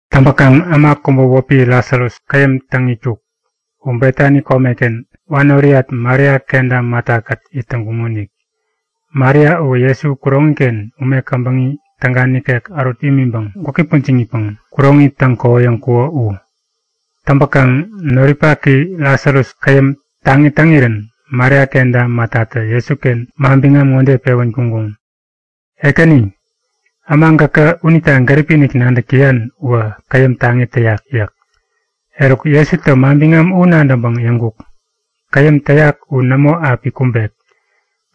Täŋpäkaŋ äma kubä wäpi Lasarus käyäm täŋ itkuk. U Betani komeken, wanoriyat Maria kenta Matakät it täŋkuŋonik. Maria uwä Jesu kuroŋi-ken ume käbäŋi täga nikek ärut imiŋpäŋ gwäki pujiŋipäŋ kuroŋi täŋ-kohoyäŋkuko u. Täŋpäkaŋ noripaki Lasarus käyäm taŋi täŋirän Maria kenta Matatä Jesuken manbiŋam ŋode pewän kuŋkuŋ; Ekäni, äma gäkä unita gäripi-inik nadäk täyan uwä käyäm taŋi täyak yäk. Eruk, Jesutä manbiŋam u nadäŋpäŋ yäŋkuk; Käyäm täyak u nämo api kumbek.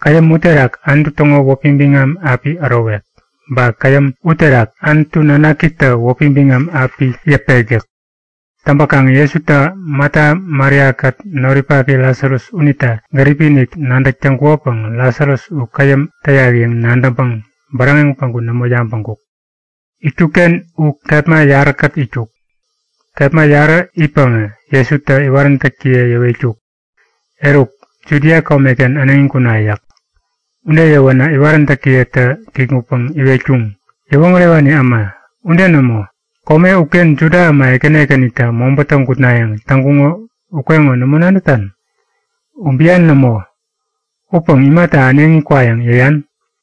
Käyäm uterak Anutu täŋo wäpi biŋam api ärowek. Ba käyäm uterak Anutu Nanakitä wäpi biŋam api yäpek yäk. Täŋkaŋ Jesutä Mata Maria-kät noripaki Lasarus unita gäripi-inik nadäk täŋkuko unita Lasarus u käyäm täyak yäŋ nadäŋpäŋ bäräŋeŋ päŋku nämo yabäŋkuk. Itkukken u kepma yaräkät itkuk. Kepma yarä itpäŋä Jesutä iwaräntäkiye yäwetkuk; Eruk, Judia komeken äneŋi kuna yäk. Ude yäwänä iwaräntäkiyetä kikŋutpäŋ iwetkuŋ; Yäwoŋärewani äma, ude nämo! Kome uken Juda äma ekäni ekänitä mobätä gutnayäŋ täŋkuŋo ukeŋo nämo nadätan? U bian nämo upäŋ imata äneŋi kwayäŋ yäyan?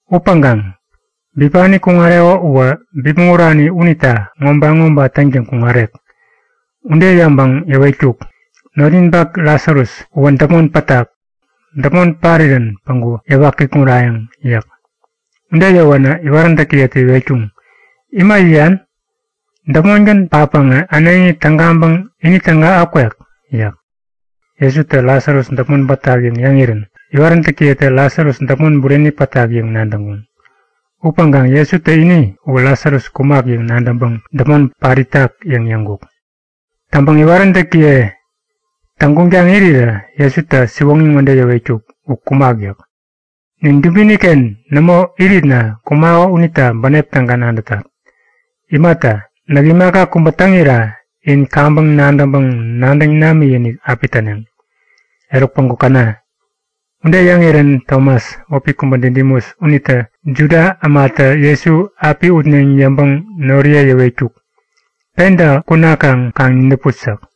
Upäŋkaŋ bipani kuŋareko uwä bipmäŋ urani unita ŋoba-ŋoba täŋtäŋ kuŋarek. Ude yäŋpäŋ yäwetkuk; Notninpak Lasarus uwä däpmon pätak. Däpmon parirän päŋku yäwa kikŋurayäŋ yäk. Ude yäwänä iwaräntäkiyetä iwetkuŋ; Ima yäyan? Däpmongän patpäŋä äneŋi tägaŋpäŋ ini täga akwek! yäk. Jesutä Lasarus däpmon pätak yäŋ yäŋirän iwaräntäkiyetä Lasarus däpmon bureni pätak yäŋ nadäŋkuŋ. Upäŋkaŋ Jesutä ini uwä Lasarus kumak yäŋ nadäŋpäŋ däpmon pat itak yäŋ yäŋkuk. Täŋpäŋ iwaräntäkiye täŋguŋtaŋ irirä Jesutä siwoŋi ŋode yäwetkuk; U kumak yäk. Nin dubini-ken nämo iritna kumako unita bänep täga nadätat. Imata, näk imaka kubä täŋira in kaŋpäŋ nadäŋpäŋ nadäŋ namikinik api täneŋ. Eruk päŋku käna! Ude yäŋirän Tomas wäpi kubä Didimus unitä Juda ämatä Jesu api utneŋ yäŋpäŋ noriye yäwetkuk; Penta kunakaŋ kaŋ nidäput! yäk.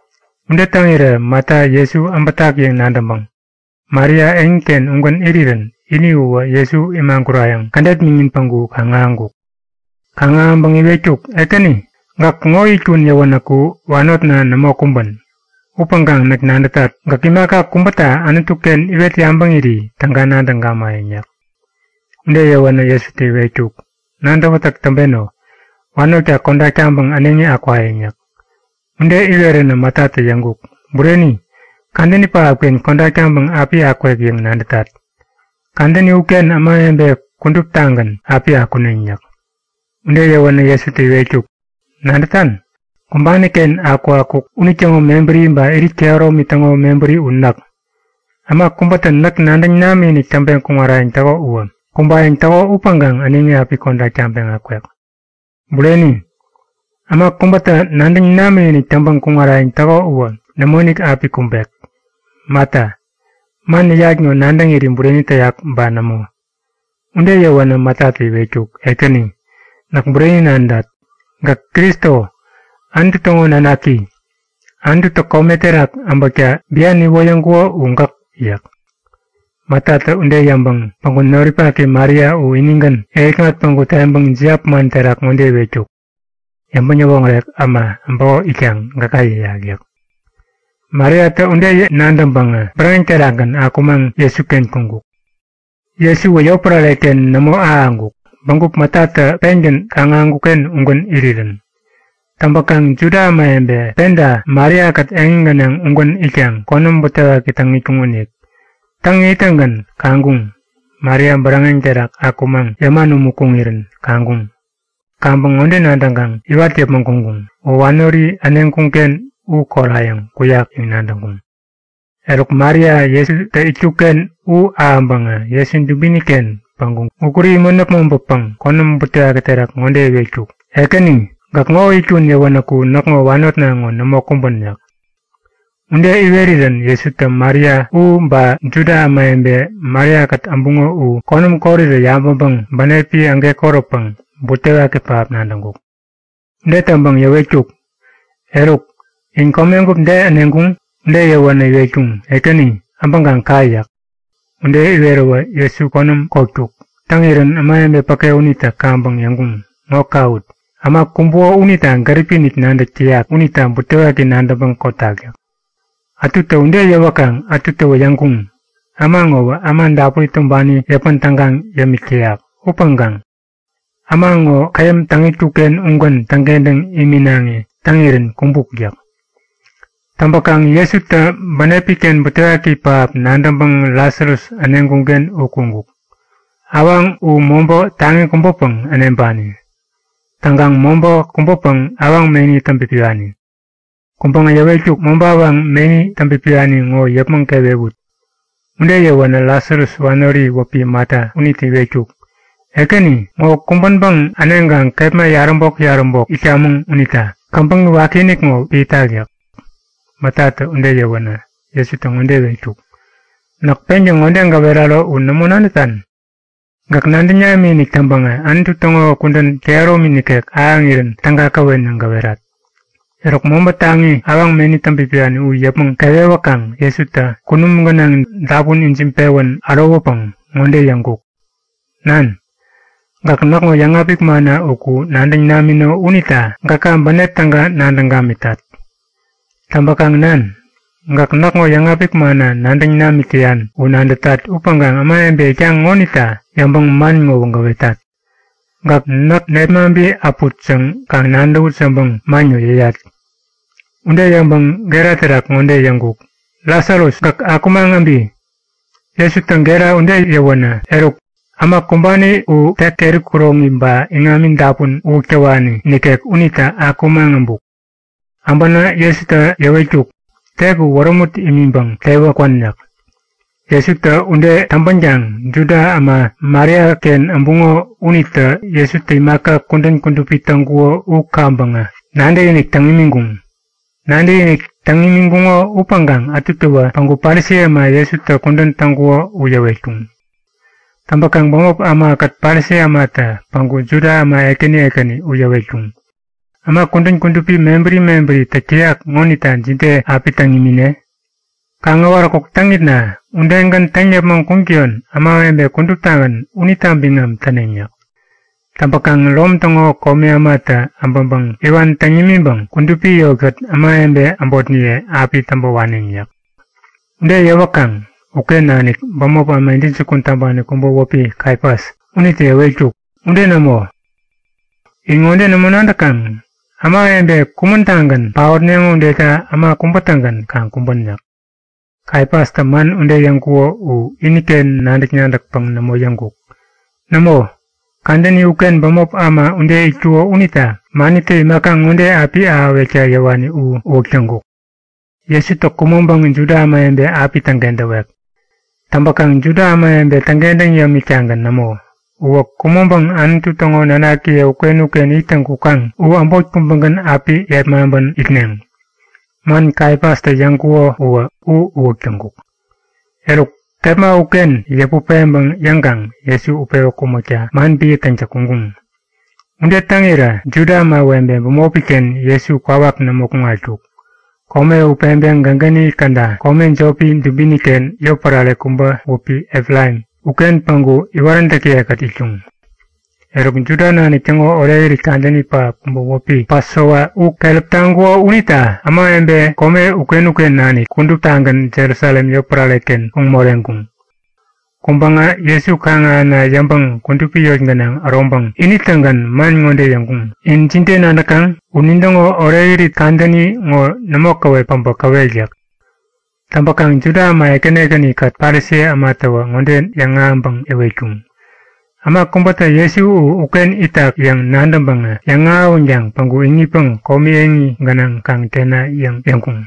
Ude täŋirä Mata Jesu äbätak yäŋ nadäŋpäŋ Maria eŋiken ugän irirän ini uwä Jesu imagurayäŋ kädet miŋin päŋku kaŋ-ahäŋkuk. Kaŋ-ahäŋpäŋä iwetkuk; Ekäni, gäk ŋo itkun yäwänäku wanotna nämo kumbän. Upäŋkaŋ näk nadätat, gäk imaka kubäta Anutu-ken iwet yabäŋiri täga nadäŋ gamayäŋ yäk. Ude yäwänä Jesutä iwetkuk; Nadäwätäk täŋpeno. Wanotka kodak taŋpäŋ äneŋi akwayäŋ yäk. Ude iweränä Matatä yäŋkuk; Bureni, kadäni pähapken kodak taŋpäŋ api akwek yäŋ nadätat. Kadäni uken ämawebe kuduptagän api akuneŋ yäk. Ude yäwänä Jesutä iwetkuk; Nadätan? Kumbani-ken akukakuk unitäŋo mebäri ba irit kehäromi täŋo mebäri u näk. Äma kubätä näk nadäŋ namikinik täŋpeŋ kuŋarayäŋ täko uwä kumbayäŋ täko upäŋkaŋ äneŋi api kodak taŋpeŋ akwek. Bureni, äma kubätä nadäŋ namikinik täŋpäŋ kuŋarayäŋ täko uwä nämoinik api kumbek! Mata, man yäyat ŋo nadäŋiri bureni täyak ba nämo? Ude yäwänä Matatä iwetkuk; Ekäni, näk bureni nadätat; Gäk Kristo, Anutu täŋo Nanaki. Anututä kome terak äbäkta bian iwoyäŋkuko u gäk yäk. Matatä ude yäŋpäŋ päŋku noripaki Maria u inigän yäŋikŋat päŋku teŋpäŋ jiap man terak ŋode iwetkuk; Yäŋpäŋ-yäwoŋärek äma äbäko itkaŋ gäka yäyak yäk. Mariatä ude nadäŋpäŋä bäräŋek terakgän akumaŋ Jesuken kuŋkuk. Jesuwä yotpärareken nämo ahäŋkuk, bägup Matatä pengän kaŋ-ahäŋkuk-ken ugän irirän. Täŋpäkaŋ Juda ämawebe penta Maria-kät eŋi gänaŋ ugän itkaŋ konäm butewaki täŋ itkuŋonik. Täŋ ittäŋgän kaŋkuŋ; Maria bäräŋek terak akumaŋ yäman umu kuŋirän kaŋkuŋ. Kaŋpäŋ ŋode nadäŋkaŋ iwat yäpmäŋ kuŋkuŋ; U wanori äneŋkuŋ-ken u korayäŋ kuyak yäŋ nadäŋkuŋ. Eruk, Maria Jesutä itkuk-ken u ahäŋpäŋä Jesu dubini-ken päŋku gukuri imän äpmoŋpäpäŋ konäm butewaki terak ŋode iwetkuk; Ekäni, gäk ŋo itkun yäwänäku näkŋo wanotna ŋo nämo kumbän yäk. Ude iwerirän Jesutä Maria u ba Juda ämawebe Maria-kät äbuŋo u konäm korirä yabäŋpäŋ bänepi ägekoräpäŋ butewaki pähap nadäŋkuk. Ude täŋpäŋ yäwetkuk; Eruk, in komegup de äneŋkuŋ? Ude yäwänä iwetkuŋ; Ekäni, äbäŋkaŋ ka yäk. Ude iweräwä Jesu konäm kotkuk. Täŋirän ämawebe päke unitä kaŋpäŋ yäŋkuŋ; Ŋo kawut! Äma kumbuko unita gäripi-inik nadäk täyak unita butewaki nadäŋpäŋ kotak yäk. Ätutä ude yäwäkaŋ ätutäwä yäŋkuŋ; Äma ŋowä äma dapuri tumbani yäpän tägaŋ yämik täyak. Upäŋkaŋ äma ŋo käyäm täŋ itkuk-ken ugän täŋkentäŋ iminaŋi täŋirän kumbuk yäk. Täŋpäkaŋ Jesutä bänepi-ken butewaki pähap nadäŋpäŋ Lasarus äneŋkuŋ-ken u kuŋkuk. Awaŋ u mobä taŋi kubäpäŋ äneŋpani. Täŋkaŋ mobä kubäpäŋ awaŋ meni täŋpipiwani. Kuŋpäŋä yäwetkuk; Mobä awaŋ meni täŋpipiwani ŋo yäpmäŋ kewewut. Ude yäwänä Lasarus wanori wäpi Mata unitä iwetkuk; Ekäni, ŋo kumbänpäŋ äneŋkaŋ kepma yaräbok-yaräbok itkamäŋ unita käbäŋi wakiinik ŋo piätak yäk. Matatä ude yäwänä, Jesutä ŋode iwetkuk; Näk pengän ŋode gäweraro u nämo nadätan? Gäk nadäŋ namikinik täŋpäŋä Anutu täŋo kudän kehäromi nikek ahäŋirän täga käwen yäŋ gäwerat. Eruk, mobä taŋi awaŋ meni peŋpipiwani u yäpmäŋ kewewäkaŋ Jesutä kunum gänaŋ dapun ijiŋpewän ärowäpäŋ ŋode yäŋkuk; Nan, gäk näkŋo yäŋapik manna uku nadäŋ namino unita gäka bänep täga nadäŋ gamitat. Täŋpäkaŋ Nan, gäk näkŋo yäŋapik manna nadäŋ namik täyan u nadätat upäŋkaŋ ämawebe itkaŋ ŋonita yäŋpäŋ man ŋowä gäwetat. Gäkä näk nepmaŋpi äput yäŋ kaŋ nadäwut yäŋpäŋ man ŋo yäyat. Ude yäŋpäŋ gera terak ŋode yäŋkuk; Lasarus, gäk akumaŋ äbi! Jesutä gera ude yäwänä, eruk äma kumbani tek keri kuroŋi ba iŋami dapun uwäk täwani nikek unitä akumaŋ äbuk. Äbänä Jesutä yäwetkuk; Tek u wärämut imiŋpäŋ tewä kwän yäk. Jesutä ude täŋpänkaŋ Juda äma Mariaken äbuŋo unitä Jesutä imaka kudän kudupi täŋkuko u kaŋpäŋä nadäkinik täŋ imiŋkuŋ. Nadäkinik täŋ imiŋkuŋo upäŋkaŋ ätutäwä päŋku Parisi äma Jesutä kudän täŋkuko u yäwetkuŋ. Täŋpäkaŋ bämop ämakät Parisi ämatä päŋku Juda äma ekäni ekäni u yäwetkuŋ; Äma kudän kudupi mebäri mebäri täk täyak ŋonita jide api täŋ imine? Kaŋäwaräkuk täŋitna udegän täŋ yäpmäŋ kuŋtäyon ämawebe kuduptagän unita biŋam täneŋ yäk. Täŋpäkaŋ Rom täŋo komi ämatä äbäŋpäŋ iwan täŋ nimiŋpäŋ kudupi yotkät ämawebe äbotniye api täŋpä waneŋ yäk. Ude yäwäkaŋ uken nanik bämop äma intäjukun täŋpani kubä wäpi Kaifas unitä yäwetkuk; Ude nämo! In ŋode nämo nadäkaŋ? Ämawebe kumän-tagän paotneŋo udeta äma kubä-tägän kaŋ kumbän yäk. Kaifastä man ude yäŋkuko u iniken nadäk-nadäkpäŋ nämo yäŋkuk. Nämo, kadäni uken bämop äma ude itkuko unita manitä imaka ŋode api ahäwekta yäwani u uwäk täŋkuk; Jesutä kumäŋpäŋ Juda ämawebe api täŋkentäwek. Täŋpäkaŋ Juda ämawebe täŋkentäŋ yämik-tagän nämo. Uwä kumäŋpäŋ Anutu täŋo nanakiye uken-uken ittäŋ kukaŋ u äbot kubägän api yepmaŋpän itneŋ. Man Kaifastä yäŋkuko uwä uwäk täŋkuk. Eruk kepma uken yäput peŋpäŋ yäŋkaŋ Jesu utpewä kumäkta man epän täŋtäŋ kuŋkuŋ. Ude täŋirä Juda ämawebe bämopi-ken Jesu kwawak nämo kuŋatkuk. Kome u peŋpeŋ gägäni käda kome jopi dubini-ken yotpärare kubä wäpi Efraim uken päŋku iwaräntäkiye-kät itkuŋ. Eruk, Juda nanik täŋo orekirit kadäni pähap kubä wäpi Pasova u keräp taŋkuko unita ämawebe kome uken-uken nanik kuduptagän Jerusalem yotpärare-kengän kuŋ moreŋkuŋ. Kuŋpäŋä Jesu kaŋ-ahäna yäŋpäŋ kudupi eŋi gänaŋ äroŋpäŋ ini-tägän man ŋode yäŋkuŋ; In jide nadäkaŋ? U nintäŋo orekirit kadäni ŋo nämo käwep päbä käwek yäk. Täŋpäkaŋ Juda äma ekäni ekäni-kät Parisi ämatäwä ŋode yäŋahäŋpäŋ yäwetkuŋ; Äma kubätä Jesu u uken itak yäŋ nadäŋpäŋä yäŋahäwänkaŋ päŋku iŋitpäŋ komi eŋi gänaŋ kaŋ tena yäŋ yäŋkuŋ.